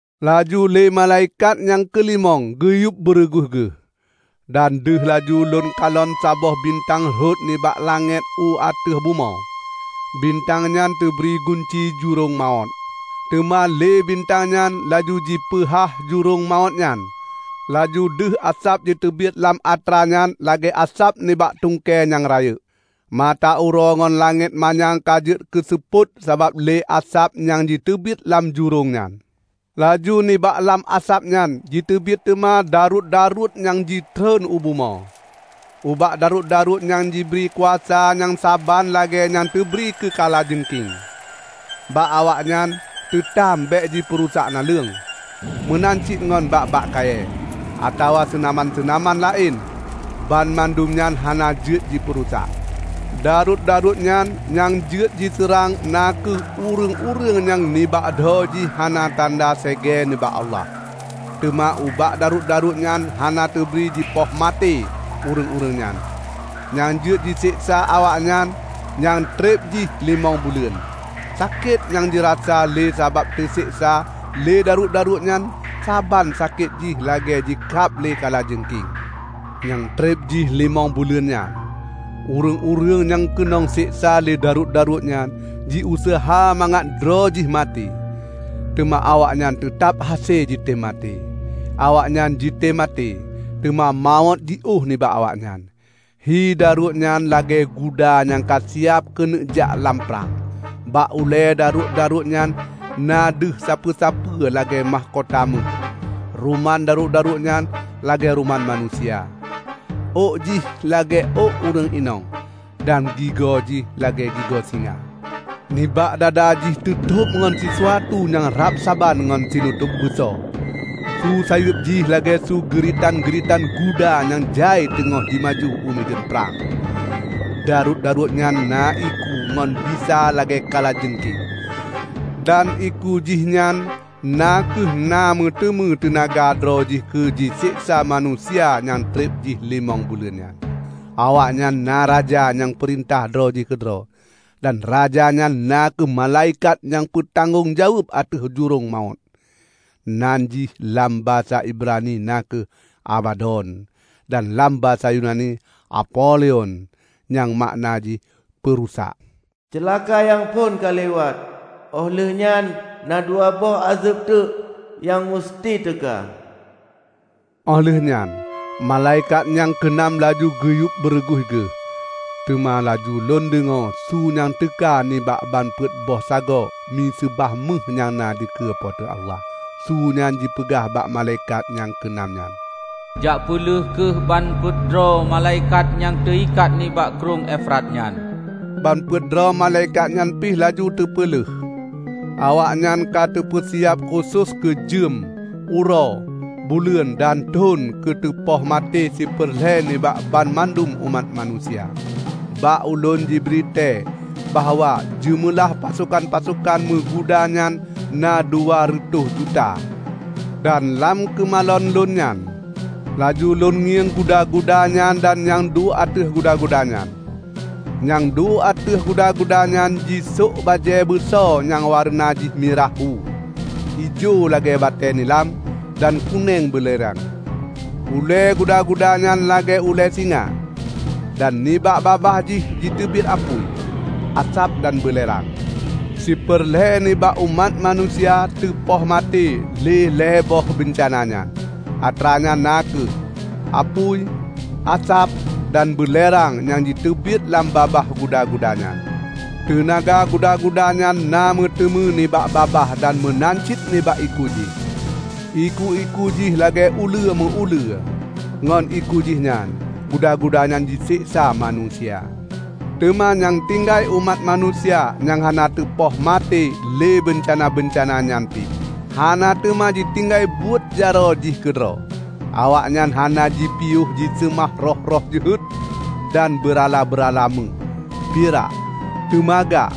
Laju lé malaikat nyang keulimong geuyueb beureuguih geuh, dan deuh laju lôn kalon saboh bintang rhot nibak langét u ateueh bumoe. Bintang nyan teubri gunci jurông mawöt. Teuma lé bintang nyan laju jipeuhah jurông mawöt nyan, laju deuh asab jiteubiet lam atra nyan lagée asab nibak tungkée nyang rayeuk. Mata uroe ngon langét manyang ka jeuet keuseupôt sabab lé asab nyang jiteubiet lam jurông nyan. Laju nibak lam asab nyan jiteubiet teuma daruet-daruet nyang jitreun u bumoe. Ubak daruet-daruet nyan jibri kuasa nyang saban lagée nyang teubri keu kala jeungking. Bak awaknyan teutam bék jipeurusak naleueng, meunan cit ngon bak-bak kayée, atawa seunaman-seunaman laén banmandum nyan hana jeuet jipeurusak. Daruet-daruet nyan nyang jeuet jiseurang na kheueh ureuëng-ureuëng nyang nibak dho jih hana tanda segée nibak Allah. Teuma ubak daruet-daruet nyan hana teubri jipoh maté ureuëng-ureuëng nyan, nyang jeuet jiseksa awaknyan nyang treb jih limong buleuen. Sakét nyang jirasa lé sabab teuseksa lé daruet-daruet nyan saban sakét jih lagée jikab lé kala jeungking. Nyang treb jih limong buleuen nyan, ureuëng-ureuëng nyang keunong seksa lé daruet-daruet nyan jiuseuha mangat droe jih maté, teuma awaknyan teutab hase jitem maté; awaknyan jitem maté, teuma mawöt jiôh nibak awaknyan. Hi daruet nyan lagée guda nyang ka siab keuneuk jak lam prang. Bak ulée daruet-daruet nyan na deuh sapeue-sapeue lagée makhkota méuh. Ruman daruet-daruet nyan lagée ruman manusia. Ôk jih lagée ôk ureuëng inong, dan gigo jih lagée gigo singa. Nibak dada jih teutôb ngon sisuatu nyang rab saban ngon sinutôb beuso. Su sayeueb jih lagée su geuritan-geuritan guda nyang jai teungoh jimaju u mideuen prang. Daruet-daruet nyan na iku ngon bisa lagée kala jeungking. Dan iku jihnyan na kheueh na meuteumé teunaga droe jih keu jiseksa manusia nyang treb jih limong buleuen nyan. Awaknyan na raja nyang peurintah droe jih keudroe, dan raja nyan na kheueh malaikat nyang meutanggong jaweueb ateueh jurông mawöt. Nan jih lam basa Ibrani na kheueh Abadon; dan lam basa Yunani Apolion (nyang makna jih "Peurusak"). Ceulaka nyang phon ka liwat. Óh lheueh nyan na dua boh ázeb teuk nyang meuseuti teuka. Óh lheueh nyan malaikat nyang keu nam laju geuyueb beureuguih geuh. Teuma laju lôn deungoe su nyang teuka nibak ban peuet boh sagoe miseubah méuh nyang na dikeue Po teu Allah. Su nyan jipeugah bak malaikat nyang keu nam nyan, "Jak peuleueh kheueh ban peuet droe malaikat nyang teuikat nibak Krueng Efrat nyan!" Ban peuet droe malaikat nyan pih laju teupeuleuh. Awaknyan ka teupeusiab khusos keu jeuem, uroe, buleuen dan thon keu teupoh maté siper lhée nibak banmandum umat manusia. Bak ulôn jibri tée bahwa jeumeulah pasokan-pasokan meuguda nyan na dua reutôh juta. Dan lam keumalon lôn nyan, laju lôn ngieng guda-guda nyan dan nyang duek ateueh guda-guda nyan. Nyang duek ateueh guda-guda nyan jisôk bajée beuso nyang wareuna jih mirah hu. Ijo lagée batée nilam, dan kunéng beulerang. Ulée guda-guda nyan lagée ulée singa, dan nibak babah jih jiteubiet apui, asab dan beulerang. Siper lhée nibak umat manusia teupoh maté lé lhée boh beuncana nyan, atra nyan na kheueh; apui, asab, dan beulerang nyang jiteubiet lam babah guda-guda nyan. Teunaga guda-guda nyan na meuteumé nibak babah dan meunan cit nibak iku jih. Iku-iku jih lagée uleue meu-ulée. Ngon iku jih nyan, guda-guda nyan jiseksa manusia. Teuma nyang tinggai umat manusia nyang hana teupoh maté lé beuncana-beuncana nyan pih, hana teuma jitinggai buet jaroe jih keudroe. Awaknyan hana jipiôh jiseumah roh-roh jeuhet dan beurala-beurala méuh, pirak, teumaga,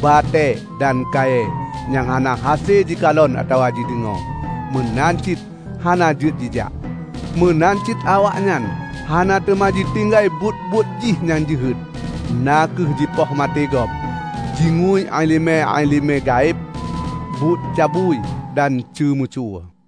batée dan kayée nyang hana hase jikalon atawa jideungoe, meunan cit hana jeuet jijak. Meunan cit awaknyan hana teuma jitinggai buet-buet jih nyang jeuhet, na kheueh jipoh maté gob, jingui iéleumé-iéleumé gaéb, buet cabui dan ceumeucue.